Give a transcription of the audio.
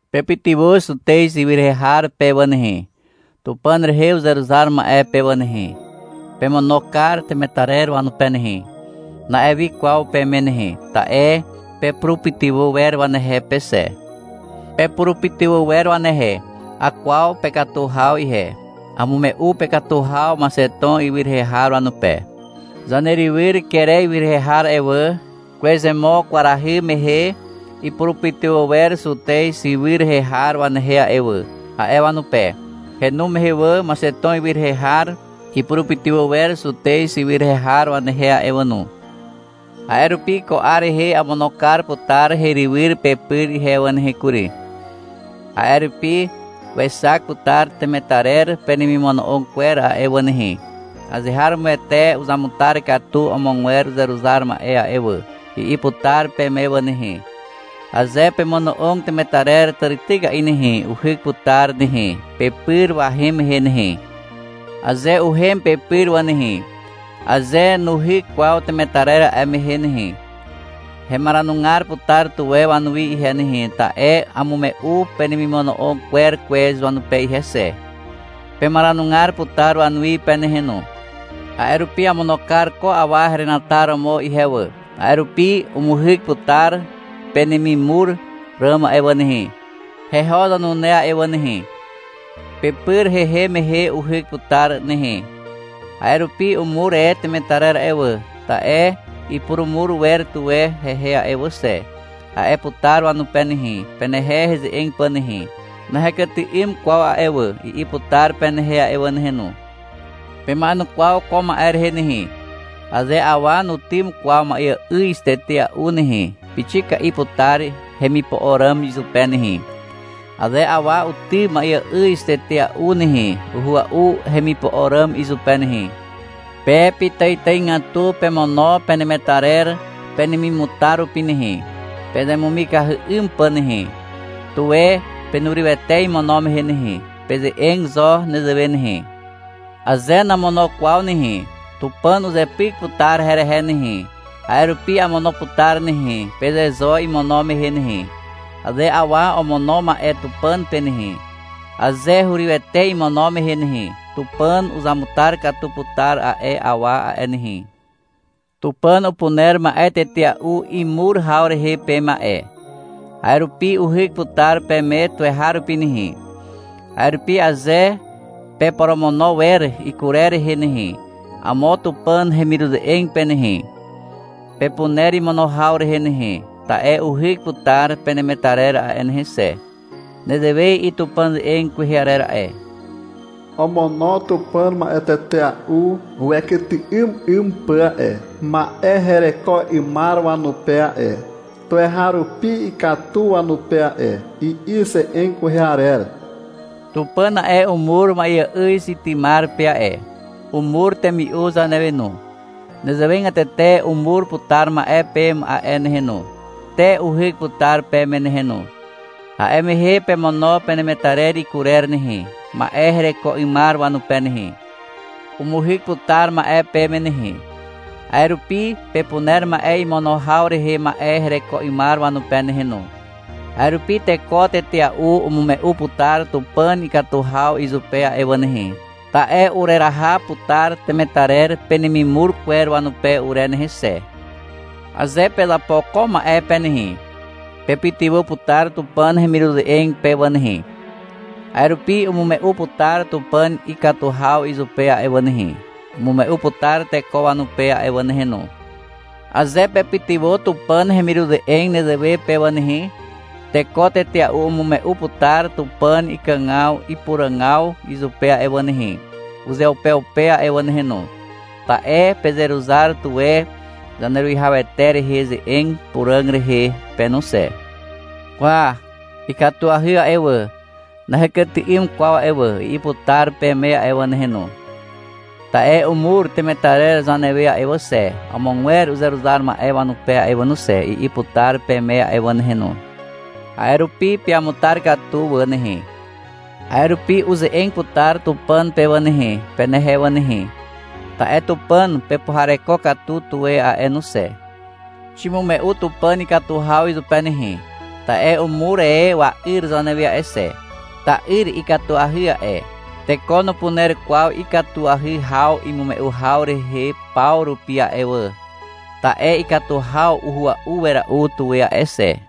— Pepytywà Zutez ywy rehe har pe wà nehe, Tupàn rehe uzeruzar ma'e pe wà nehe. Pemono kar temetarer wanupe nehe, na'e wi kwaw peme nehe. Ta'e pepurupytywà wer wanehe pe xe. Pepurupytywà wer wanehe. Akwaw pekatu haw ihe. Amume'u pekatu haw Maxeton ywy rehe har wanupe. — Zanerywyr Kere ywy rehe har a'e wà, kwezomo kwarahy mehe ipurupytywà wer Zutez ywy rehe har wanehe a'e wà, a'e wanupe. Henu mehe wà, Maxeton ywy rehe har ipurupytywà wer Zutez ywy rehe har wanehe a'e wà no. A'e rupi ko 'ar rehe amono kar putar herywyr pepyr ihe wà nehe kury. A'e rupi wexak putar temetarer penemimono'og kwer a'e wà nehe. — Azeharomoete uzamutar katu amogwer uzeruzar ma'e a'e wà, i'i putar peme wà nehe. Aze pemono'og temetarer tàrityka'i nehe, uhyk putar nehe, pepyr wahem mehe nehe. Aze uhem pepyr wà nehe, aze nuhyk kwaw temetarer a'e mehe nehe, hemaranugar putar tuwe wanuwi ihe nehe, ta'e amume'u penemimono'og kwer kwez wanupe ihe xe. Pemaranugar putar wanuwi pe nehe no. A'e rupi amono kar ko awa herenataromo ihe wà. A'e rupi umuhyk putar penemimur ràm a'e wà nehe, heho zanune a'e wà nehe. Pepyr hehem mehe uhyk putar nehe. A'e rupi — Umur e temetarer a'e wà, ta'e ipurumur wer tuwe hehe a'e wà xe, a'e putar wanupe nehe, penehe heze'eg pà nehe. — Nahekyty'ym kwaw a'e wà, i'i putar penehe a'e wà nehe no. Pema'enukwaw ko ma'e rehe nehe. Aze awa nutym kwaw ma'eà'yz tetea'u nehe, pixika'i putar hemipo'o ràm izupe nehe. Aze awa utym ma'eà'yz tetea'u nehe, uhua'u hemipo'o ràm izupe nehe. Pe pitàitàigatu pemono penemetarer penemimutar rupi nehe, pezemumikahy 'ym pà nehe. Tuwe penurywete imono mehe nehe. Peze'eg zo nezewe nehe. — Aze namono kwaw nehe, Tupàn uzepyk putar herehe nehe, a'e rupi amono putar nehe, peze zo imono mehe nehe. Aze awa omono ma'e Tupàn pe nehe, aze hurywete imono mehe nehe, Tupàn uzamutar katu putar a'e awa a'e nehe. Tupàn upuner ma'e tetea'u imur haw rehe peme a'e. A'e rupi uhyk putar peme tuweharupi nehe. A'e rupi aze peporomono wer ikurer rehe nehe, amo Tupàn hemiruze'eg pe nehe, pepuner imono haw rehe nehe, ta'e uhyk putar penemetarer a'e nehe xe. Nezewe i'i Tupàn ze'eg kwehe arer a'e. — Omono Tupàn ma'e tetea'u wekyty'ym 'ym pà a'e, ma'e hereko 'ymar wanupe a'e. Tuweharupi ikatu wanupe a'e, i'i ze'eg kwehe arer. Tupàn a'e, umur ma'eà'yz itymar pe a'e. Umur temi'u zanewe no. Nezewegatete umur putar ma'e peme a'e nehe no, te uhyk putar peme nehe no. A'e mehe pemono penemetarer ikurer nehe, ma'e hereko 'ymar wanupe nehe. Umuhyk putar ma'e peme nehe, a'e rupi pepuner ma'e imono haw rehe ma'e hereko 'ymar wanupe nehe no. A'e rupi teko tetea'u umume'u putar Tupàn ikatu haw izupe a'e wà nehe, ta'e ureraha putar temetarer penemimur kwer wanupe ure nehe xe. Aze pezapo ko ma'e pe nehe, pepytywà putar Tupàn hemiruze'eg pe wà nehe. A'e rupi umume'u putar Tupàn ikatu haw izupe a'e wà nehe, umume'u putar teko wanupe a'e wà nehe no. Aze pepytywà Tupàn hemiruze'eg nezewe pe wà nehe, teko tetea'u umume'u putar Tupàn ikàgaw ipuràgaw izupe a'e wà nehe, uzeupeupe a'e wà nehe no, ta'e pezeruzar tuwe Zaneruwihawete rehe ze'eg puràg rehe pe no xe. — Kwa, ikatuahy a'e wà, nahekyty'ym kwaw a'e wà, i'i putar peme a'e wà nehe no. — Ta'e umur temetarer zanewe a'e wà xe, amogwer uzeruzar ma'e wanupe a'e wà no xe, i'i putar peme a'e wà nehe no. A'e rupi peamutar katu wà nehe. A'e rupi uze'eg putar Tupàn pe wà nehe, penehe wà nehe. Ta'e Tupàn pepuhareko katu tuwe a'e no xe. Ximume'u Tupàn ikatu haw izupe nehe, ta'e umur e wa'yr zanewe a'e xe. Ta'yr ikatuahy a'e. Teko nupuner kwaw ikatuahy haw imume'u haw rehe paw rupi a'e wà. Ta'e ikatu haw uhua'u wera'u tuwe a'e xe.